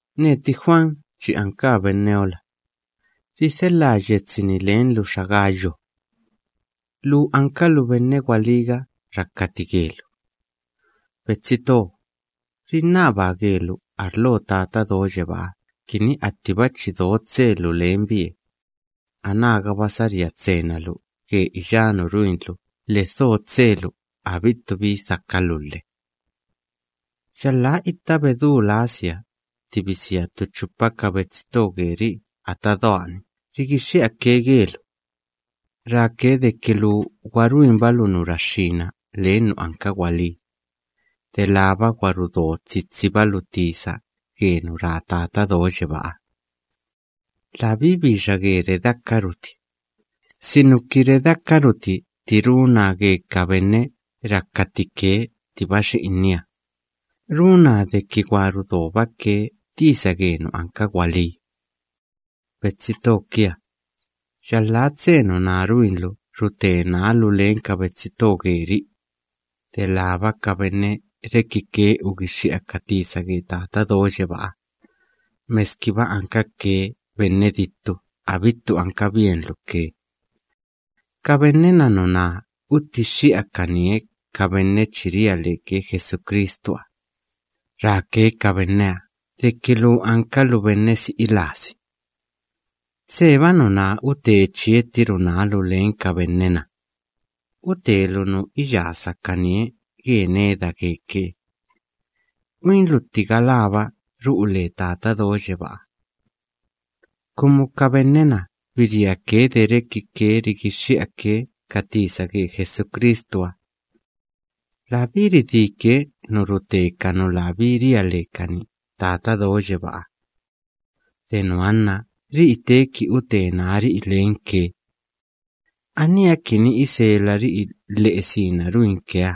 Neti Juan chi ankaa benneola; ridhelhaa yetsi‑ni lenlu xa Gayo. Lu ankalu benne gwalíga rakati gelu. Betsi to, rinnabaa gelu arlo Tata Do Yebáha kini attiba chi do tselu lenbie, anágaba saría tsena lu ge iyá nu ruinlu lhe dho tselu abittu bi dhakalu lhe. Yalhá itta bedú lasia tti bisia ttu chupa ka betsi to geri'i ata doa‑ni rigixxi'ake gelu, ráke deki lu gwa ruinbalu nu raxxína len nu anka gwalí, delába gwa rudo tsitsibalu tisa ge nu ra Tata Do Yebáha. Labí bixa ge redeakaruti, sinuki redeakaruti tti runaa ge ka benne rakati ke ttiba xi'inia, runaa deki gwa rudobake tisa ge nu anka gwalí. Betsi to kia, yalhá tse nuná ruinlu rute nálu len ka betsi to geri'i, delába ka benne rekike ugixxi'a ka tisa ge Tata Do Yebáha, meskiba ankake benne dittu abittu ankabienlu ke. Ka benne‑na nuná utixxi'ake arlo iyá ka benne chi ria leke Jesucristuha se'e‑ni, ráke deki lu ankalu benne si'i lasi. Tseba nuná ute chiettiru nálu len ka benne‑na, utelu nu iyasakanie ge neda geke. Uinlu atti galába ru'u le Tata Do Yebáha. Kumu ka benne‑na biriake de rekike rigixxi'ake ka tisa ge Jesucristuha. Labí ridíke nu rute ka nu labí ria lekani Tata Do Yebáha. De nuha nna ri'i teeki ute nári'i lenke. Aníha kini iselari'i lhe'e sina ruinkeha,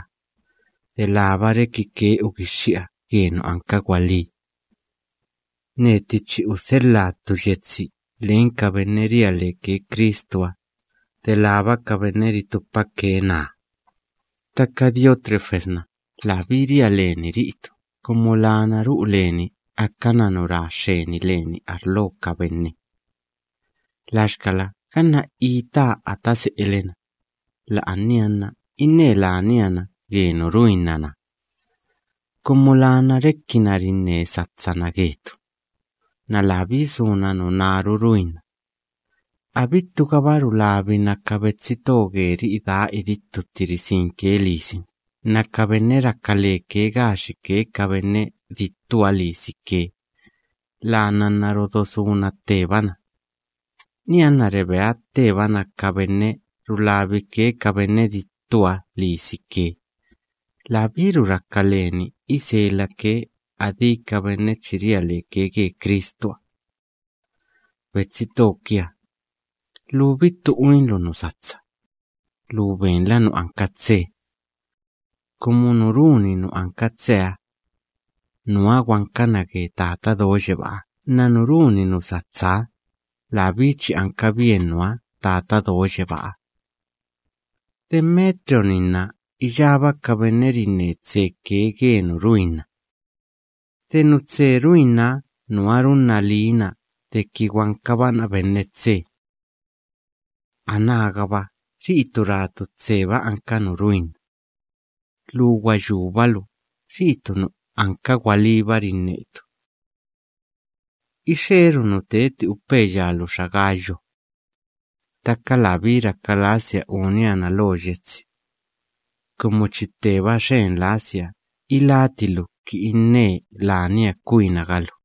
delába rekike ugixxi'a ge nu anka gwalí. Neti chi udhelhaa ttu yetsi len ka benne ria leke Cristuha ritupake naa; ttaka Diótrefes‑na labí ria leni ri'itu kumu lana ru'u leni akana nu ra xxeni leni arlo ka benne. Laxkala ganna itaa ata se'ele‑na, la'ania nna inne lania na ge nu ruinna‑na, kumu lana rekina rinne satsana getu, nna labí suna nunáru ruinna, abittugaba rulabina ka betsi to geri'i daa idittu tti risinke lisini nna ka benne raka leke gaxike ka benne dittuha lisike, lana nna rodosuna ttebana, nianna rebea ttebana ka benne rulabike ka benne dittuha lisike, labíru raka leni iselake adí ka benne chi ria leke ge Cristuha. Betsi to kia, lu bittu uinlu nu satsa; lu benla nu anka tse. Kumu nu runi nu anka tseha, nuha gwankana ge Tata Do Yebáha, nna nu runi nu satsaha, labí chi ankabien nuha Tata Do Yebáha. Demetrio‑ni nna iyába ka benne rinne tseke ge nu ruinna. De nu tse ruinnaha nuha runna liina deki gwankabana benne tse. Anágaba ri'itu ratu tseba anka nu ruinna, lu gwa yúbalu ri'itu nu anka gwalíba rinnetu. Ixeeru nu teti upeya lu xa Gayo, ttaka labí raka lasia unia na lo yetsi, kumu chi tteba xxen lasia iláti lu kini inne lania kwinaga lu.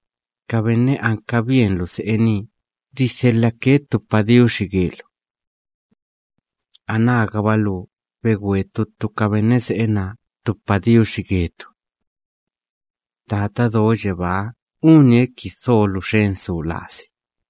Ka benne ankabienlu se'e nii ridhelhake ttu padiuxi gelu. Anágaba lu begwe ttu ttu ka benne se'e naa ttu padiuxi getu. Tata Do Yebáha unie kini dholu xen su lasi.